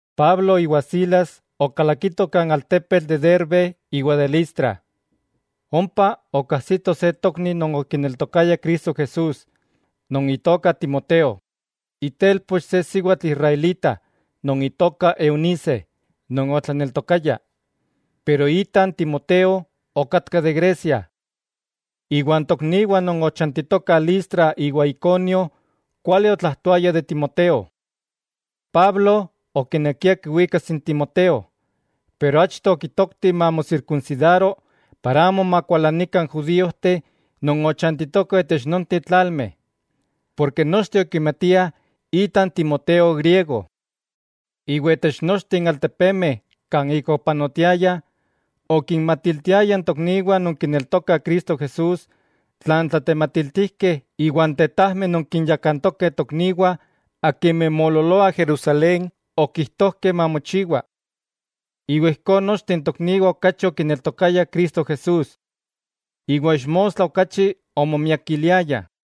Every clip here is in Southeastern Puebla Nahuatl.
Pablo iwa Silas okalakitoh kan altepetl de Derbe iwa de Listra, ompa okajsitoh se tokni non okineltokaya Cristo Jesús non itoka Timoteo, itelpoch se siwatl israelita non itoka Eunice non otlaneltokaya, pero ita n Timoteo okatka de Grecia. Iwa n tokniwah non ochantitokah Listra iwa Iconio kuali otlajtoayah de Timoteo. Pablo okinekia kiwikas n Timoteo, pero achto okitokti mamosirkunsidaro para amo makualanikah n judíojteh non ochantitokah itech nonteh tlalmeh, porke nochteh okimatiah ita n Timoteo griego. Iwa itech nochteh n altepemeh kan ik opanotiayah, okinmatiltiayah n tokniwah non kineltokah Cristo Jesús tlan n tlatematiltijkeh iwa n tetajmeh non kinyakantokeh n tokniwah akimeh moololoah Jerusalén okijtojkeh mamochiwa. Iwa ijkó nochteh n tokniwah okachi okineltokayah Cristo Jesús, iwa ixmostla okachi omomiakiliayah.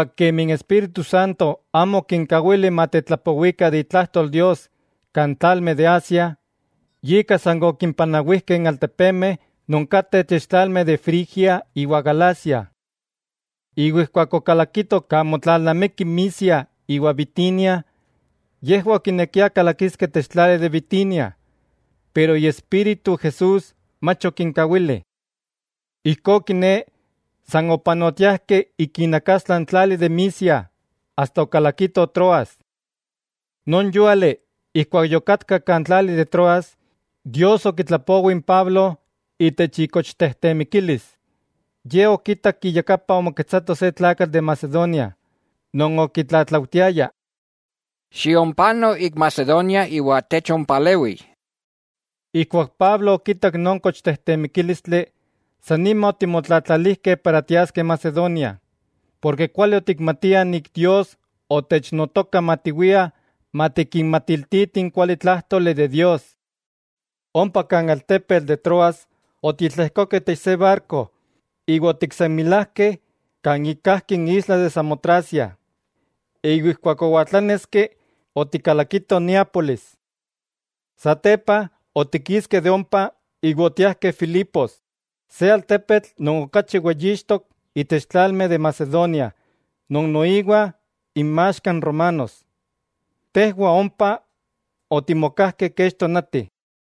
Kemi n Espíritu Santo amo okinkawili matetlapowikah de itlajtol Dios kan tlalmeh de Asia, yika san okimpanawijkeh n altepemeh non kateh itech tlalmeh de Frigia iwa Galacia. Iwa ijkuak okalakitoh kan motlalnamikih Misia iwa Bitinia, yejwah okinekiah kalakiskeh itech tlali de Bitinia, pero Iespíritu Jesús mach okinkawili. Ijkó kiné, san opanotiajkeh ik inakastla n tlali de Misia, asta okalakitoh Troas. Non yúali ijkuak yokatkah kan tlali de Troas, Dios okitlapowi n Pablo itech itejtemikilis. Ye okitak iyakapa omoketsako se tlakatl de Macedonia non okitlatlaujtiaya: “Xiompano ik Macedonia iwa techompalewi.” Ijkuak Pablo okitak non tejtemikílistli, san nima otimotlatlalijkeh para tiaskeh Macedonia, porke kuali otikmatiah Dios otechnotoka matiwiah matikinmatiltitih n kualitlájtoli de Dios. Ompa kan altepetl de Troas otitlejkokeh itech se barko iwa otiksenmilajkeh kan ik kajki n isla de Samotracia, iwa ijkuak owaltláneski otikalakitoh Neápolis. Satepa otikiskeh de ompa iwa otiajkeh Filipos, se altepetl non okachi weyixtok itech tlalmeh de Macedonia non noiwa inmaxka n romanos. Tejwah ompa otimokajkeh kech tonati.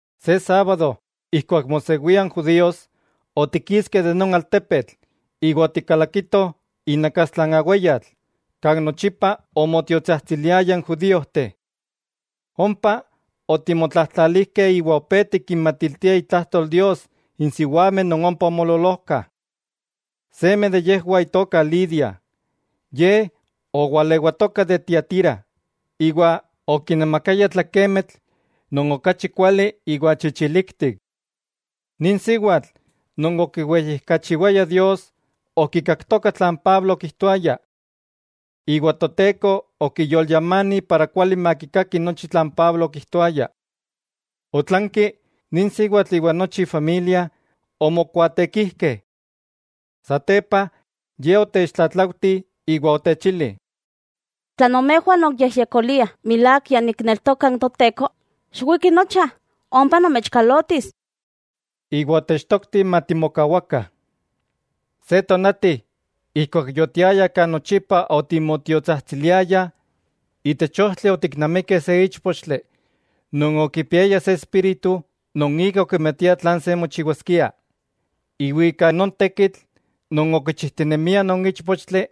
Se sábado ijkuak mosewia n judíos, otikiskeh de non altepetl iwa otikalakitoh inakastla n aweyatl, kan nochipa onmotiotsajtsiliayah n judíojteh. Ompa otimotlajtlalijkeh iwa opé tikinmatiltiah itlajtol Dios n siwameh non ompa omoololojkah. Seme de yejwah itoka Lidia. Ye owalewatoka de Tiatira iwa okinamakaya tlakemitl non okachi kuali iwa chichiliktik. Nin siwatl non okiweyijkachiwaya Dios, okikaktoka tlan Pablo okijtoaya. Iwa Toteko okiyolyamani kuali makikaki nochi tlan Pablo okijtoaya. Otlanki, nin siwatl iwa nochi ifamilia omokuaatekijkeh. Satepa ye otechtlatlaujti iwa otechili: —Tla nomejwah nonkiyejyekoliah milák ya nikneltoka n Toteko, xiwikih nocha, ompa nomechkalotis. Iwa otechtoktih matimokawakah. Se tonati ijkuak yotiayah kan nochipa otimotiotsajtsiliayah, itech ojtli otiknamikeh se íchpochtli non okipiaya se espíritu non ika okimatia tlan se mochiwaskia. Iwa ika non tekitl non okichijtinemia non íchpochtli,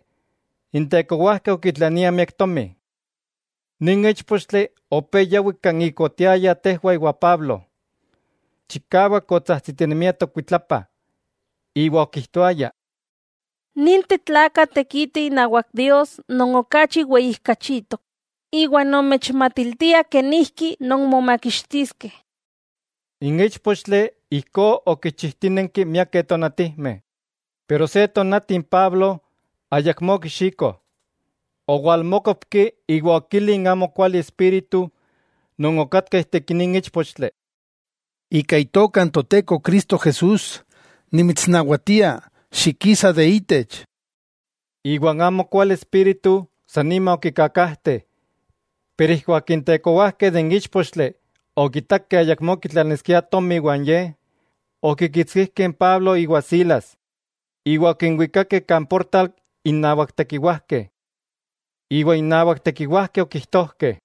n tekowajkeh okitlaniah miak tomi. Nin íchpochtli opé yawi kan ik otiayah tejwah iwa Pablo. Chikawak otsajtsitinemia tokuitlapa, iwa okijtoaya: —¡Ninteh tlakah tekitih inawak Dios non okachi weyijkachitok, iwa nomechmatiltiah kenijki nonmomakixtiskeh! N íchpochtli ijkó okichijtínenki miakeh tonatijmeh, pero se tonati n Pablo ayakmó okixiko, owalmókopki iwa okili n amokuali espíritu non okatka ijtik nin íchpochtli: —Ika Itoka n Toteko Cristo Jesús, nimitsnawatia, xikisa de itech. Iwa n amokuali espíritu san nima okikakajte. Pero ijkuak n tekowajkeh de n íchpochtli okitakeh ayakmó kitlaniskiah tomi iwan ye, okikitskijkeh n Pablo iwa Silas iwa okinwikakeh kan portal innawak tekiwajkeh. Okinwikakeh innawak tekiwajkeh iwa okijtojkeh: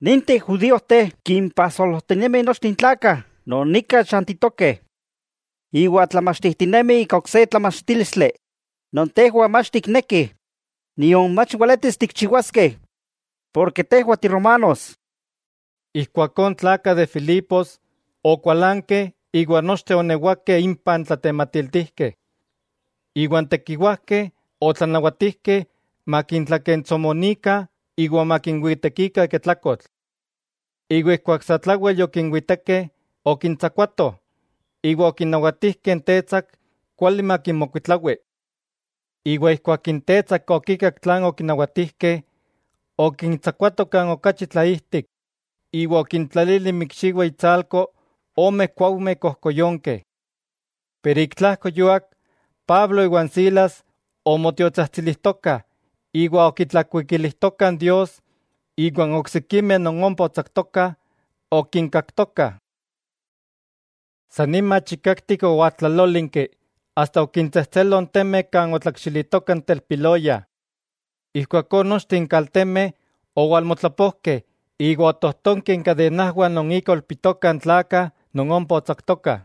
—Ninteh judíojteh kimpajsolojtinemih nochteh n tlakah non nika chantitokeh. Iwa tlamachtijtinemih ika ok se tlamachtílistli non tejwah mach tiknekih nion mach weletis tikinchiwaskeh, porke tejwah ti romanos. Ijkuakó n tlakah de Filipos okualankeh iwa nochteh oonewakeh impah n tlatematiltijkeh. Iwa n tekiwajkeh otlanawatijkeh makintlakentsomonikah iwa makinwitekikah ika tlakotl. Iwa ijkuak satlawel yokinwitekeh, okintsakuatoh, iwa okinawatijkeh n tetsak kuali makinmokuitlawi. Iwa ijkuak n tetsak okikak tlan okinawatijkeh, okintsakuato kan okachi tlaijtik, iwa okintlalili inmikxiwah intsalko ome kuaujmeh kojkoyonkeh. Pero ik tlajko yuak, Pablo iwan Silas omotiotsajtsilijtokah iwa okitlakuikilijtokah Dios, iwa n oksikimeh non ompa otsaktokah okinkaktokah. San nima chikaktik owaltlalólinki asta okintsejtselo n temeh kan otlakxilitoka n telpiloya. Ijkuakó nochteh n kaltemeh owalmotlapojkeh iwa otojtonkeh inkadenajwah non ika oilpitokah n tlakah non ompa otsaktokah.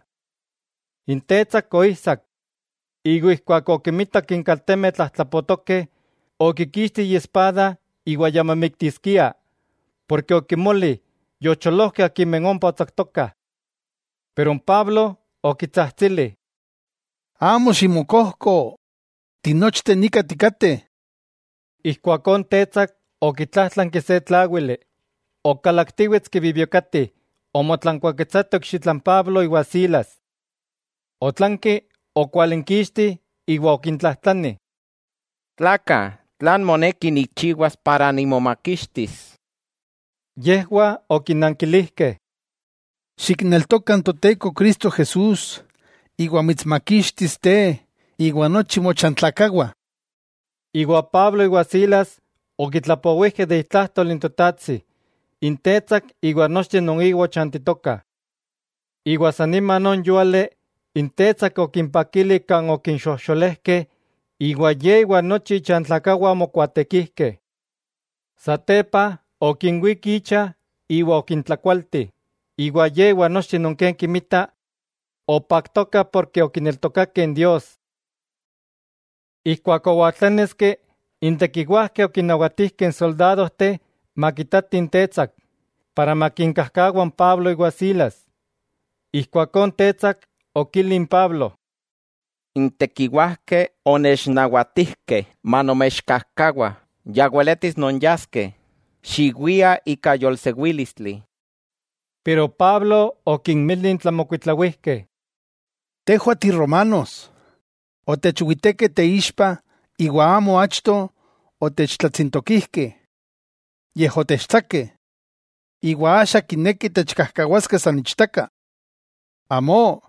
N tetsak oijsak, iwa ijkuak okimitak n kaltemeh tlajtlapotokeh, okikixti iespada iwa ya momiktiskia, porke okimoli yocholojkeh akimeh ompa otsaktokah. Pero n Pablo okitsajtsili: —Amo ximokojko, tinochteh nika tikateh. Ijkuakó n tetsak okitlájtlanki se tláwili, okalaktiwetski bibiokati omotlankuáketsato ikxitla n Pablo iwan Silas. Otlanki okwalinkixti iwa okintlajtlani: —Tlakah, ¿tlan moneki nikchiwas para nimomakixtis? Yejwah okinankilijkeh: —Xikneltoka n Toteko Cristo Jesús iwa mitsmakixtis te, iwa nochi mochantlakawah. Iwa Pablo iwa Silas okitlapowijkeh de itlajtol n Totajtsi n tetsak iwa nochteh non inwah ochantitokah. Iwa san nima non yúali, n tetsak okimpakili kan okinxojxolejkeh, iwa ye iwa nochi ichantlakawah omokuaatekijkeh. Satepa okinwík icha iwa okintlakualti, iwa ye iwa nochteh non ken kinmitah opaktokah porke okineltokakeh Dios. Ijkuak owaltláneski, n tekiwajkeh okinnawatijkeh n soldadojteh makitatih n tetsak, para makinkajkawa n Pablo iwan Silas. Ijkuakó n tetsak okili n Pablo: —N tekiwajkeh onechnawatijkeh manomechkajkawa, ya weletis nonyaskeh, xiwiah ika yolsewílistli. Pero Pablo okinmili n tlamokuitlawijkeh: —Tejwah tiromanos, otechwitekeh teixpa iwa amo achto otechtlatsintokijkeh, yej otechtsakeh; ¿Iwa axa kinekih techkajkawaskeh san ichtaka? ¡Amó!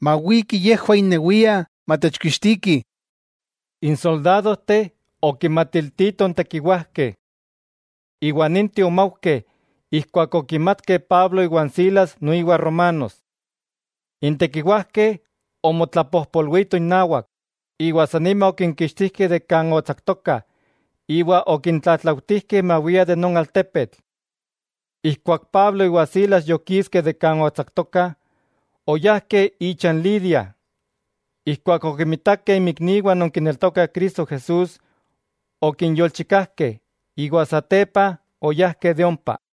Mawikih yejwah innewiah matechkixtikih. N soldadojteh okinmatiltitoh n tekiwajkeh. Iwa ninteh omaujkeh ijkuak okimatkeh Pablo iwan Silas noiwa romanos. N tekiwajkeh omotlapojpolwitoh innawak, iwa san nima okinkixtijkeh de kan otsaktokah iwa okintlatlaujtijkeh mawiah de non altepetl. Ijkuak Pablo iwa n Silas yokiskeh de kan otsaktokah, oyajkeh icha n Lidia. Ijkuak okimitakeh inmikniwah non kineltokah Cristo Jesús okinyolchikajkeh, iwa satepa oyajkeh de ompa.